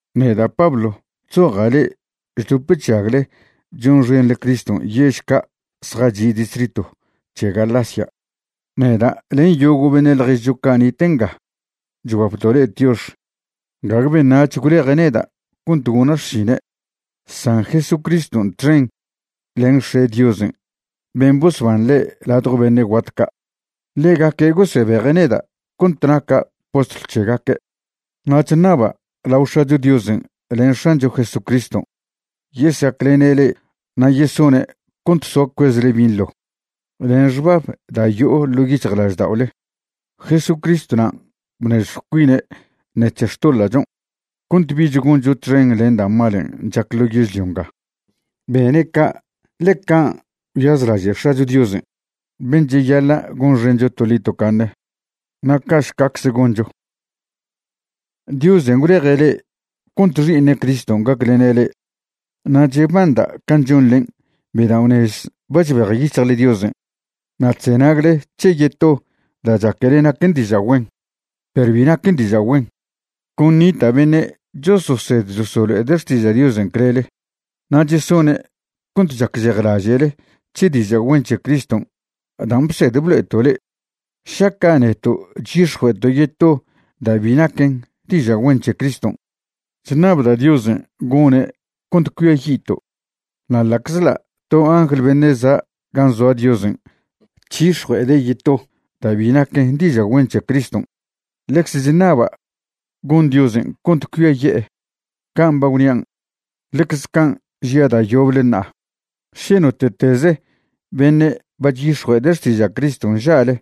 Neda' Pablo chzoja' le'e chdop chžagle chonxenḻe Criston' yež ca' zjachi' distritw c̱he Galacia. Neda' len yogo' beṉe' ḻježcho ca' nite' nga chguapto' le'e tiox. Gague beṉac̱h gwlej neda' cont gona' xšine', san Jesucriston' txen len X̱e' Diosen' ben' bosban ḻe' ladjo beṉe' guat ca', ḻegaque' gosebeje' neda' cont naca' postlw c̱hegaque'. Na' chṉaba' lao X̱acho Diosen' len X̱ancho Jesucriston' yesaclene' le'e na' yesone' cont soa cuezle binḻo len xbab da' yo'o ḻo' yic̱hjlažda'ole. Jesucristnan' bnežjw cuine' ṉec̱he xtoḻa'chon' cont bich goncho txen len da' malen' chac ḻo yežlio nga. Bene' ca' ḻe can' gwyazlaže' X̱acho Diosen' ben' cheyaḻa' gonxencho toḻi tocaṉe. Na' ca'šcacze goncho. Diosen' gwleje' le'e cont Xi'iṉe' Criston' gaclene' le'e. Na' chebanda' can' chonḻen' bedao'nez ba chbejyic̱hjle Diosen' na' chzenagle c̱he yeto da' chaquele naquen diža' güen. Perw bi naquen diža' güen. Con nita' beṉe' chososed chosolo'ede' xtiža' Diosen' clele na' chesone' cont chacžejlaže'le c̱he diža' güen c̱he Criston' dan' bsed blo'eto' le'e. Šaca' neto' c̱hix̱jue'eto' yeto da' bi naquen diža' güen c̱he Criston', chṉabda' Diosen' gone' cont cuiayi'to'. Na' ḻa'czḻa' to angl beṉe' za' gan' zoa Diosen' c̱hix̱jue'ede' yeto da' bi naquen diža' güen c̱he Criston', ḻecze chṉaba' gon Diosen' cont cuiaye'e. Can' ba gwnian', ḻecze can' žia' da' yoble ṉa'a: še note'teze beṉe' ba chyix̱jue'ede' xtiža' Criston' nža'le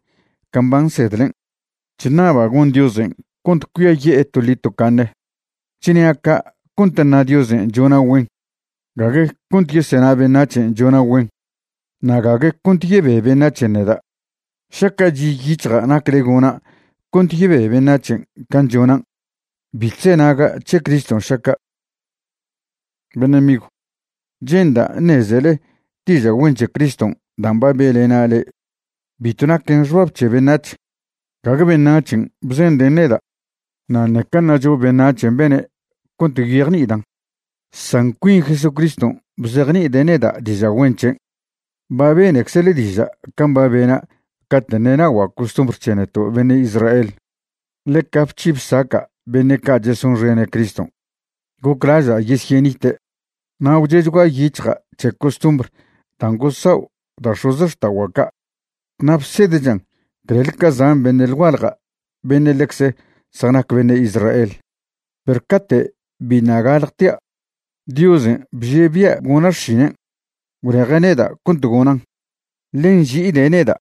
can' ba nsedlen, chṉaba' gon Diosen' cont cuiaye'e toḻi tocaṉe. Chnia' ca' cont ṉa Diosen' chona' güen, gague cont yesena beṉac̱hen' chona' güen, na' gague cont yebe beṉac̱hen' neda'. Šaca' chi' yic̱hja' nacle gona' cont yebe beṉac̱hen' can' chonan', bi chzenaga' c̱he Criston' šaca'. Beṉe' migw, che'nda' ṉezele diža' güen c̱he Criston' dan' ba be'lena' le'e bitw naquen xbab c̱he beṉac̱h. Gague beṉac̱hen' bzenden' neda', na' ṉeca ṉacho beṉac̱hen' bene' cont gwyejni'idan', san cuin Jesucriston' bzejni'ide' neda' diža' güen c̱hen'. Ba beneczele diža' can' ba bena' cate' ṉe' na'ogua' costumbr c̱he neto' beṉe' Israel. Ḻeca bc̱hi bsaca' beṉe' ca' chesonxene' Criston', goclaža' yesyeṉite'. Na' gwche'chgua yic̱hja' c̱he costumbr dan' gosa'o da' x̱ozxta'ogua' ca' na' bsedchan' clel ca zan beṉe' ḻ gualja' beṉe' ḻecze zjanac beṉe' Israel. Perw cate' biṉa' galjtia', Diosen' bžie' bia' gona' xšinen'. Gwleje' neda' cont gonan', ḻe nži'ide' neda'.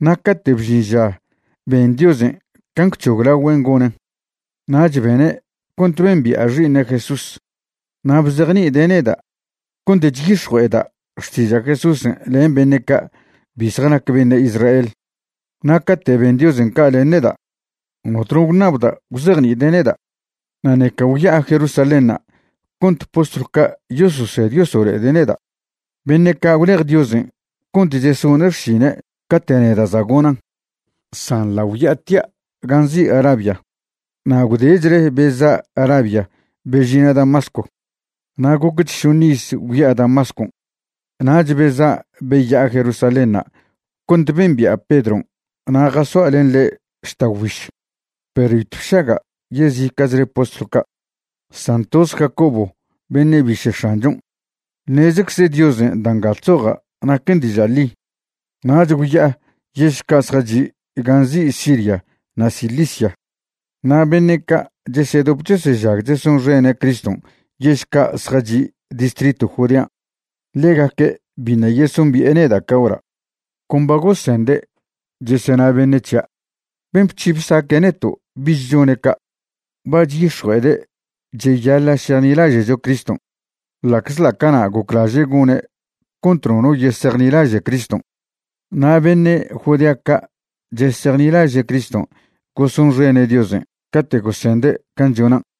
Na' cate' bžin ža ben Diosen' can' gwc̱hoglagüen' gone', nach bene' cont bembi'a Xi'iṉe' Jesús. Na' bzejni'ide' neda' cont chyix̱jue'eda' xtiža' Jesúsen' len beṉe' ca' bi zjanac beṉe' Israel. Na' cate' ben Diosen' ca' len neda' notno gwṉabda' gwzejni'ide' neda'. Na' ṉeca gwya'a Jerusalénṉa' cont postlw ca' yososed yosolo'ede' neda', beṉe' ca' gwlej Diosen' cont chesone' xšine' cate' neda' za' gonan'. San ḻa' gwya'atia' gan' nzi' Arabia, na' gwdechle beza' Arabia bežina' Damasco. Na' gocch šoṉ iz gwya'a Damascon', nach beza' beya'a Jerusalénṉa' cont bembi'a Pedron' na' jasoa' len ḻe' žta'gwbiž. Perw bitw bšaga' yezica'chle postlw ca' san toze Jacobo beṉe' biše' X̱anchon'. Ṉezecze Diosen' da' nga chzoja' naquen diža' ḻi. Nach gwya'a yež ca' zjachi' gan' nzi' Siria na' Cilicia. Na' beṉe' ca' chesedop chesežag chesonxene' Criston' yež ca' zjachi' distritw Judean', ḻegaque' biṉa' yesombi'e neda' ca hora'. Con ba gosende' chesena beṉe' c̱hia': “Ben' bc̱hi bsaque' neto' bich chone' ca'. Ba chyix̱jue'ede' cheyaḻa' šejnilaže'cho Criston', ḻa'czḻa' cana' goclaže' gone' cont nono yesejnilaže' Criston'.” Na' beṉe' Judea ca' chesejnilaže' Criston' gosonxene' Diosen' cate' gosende' can' chonan'.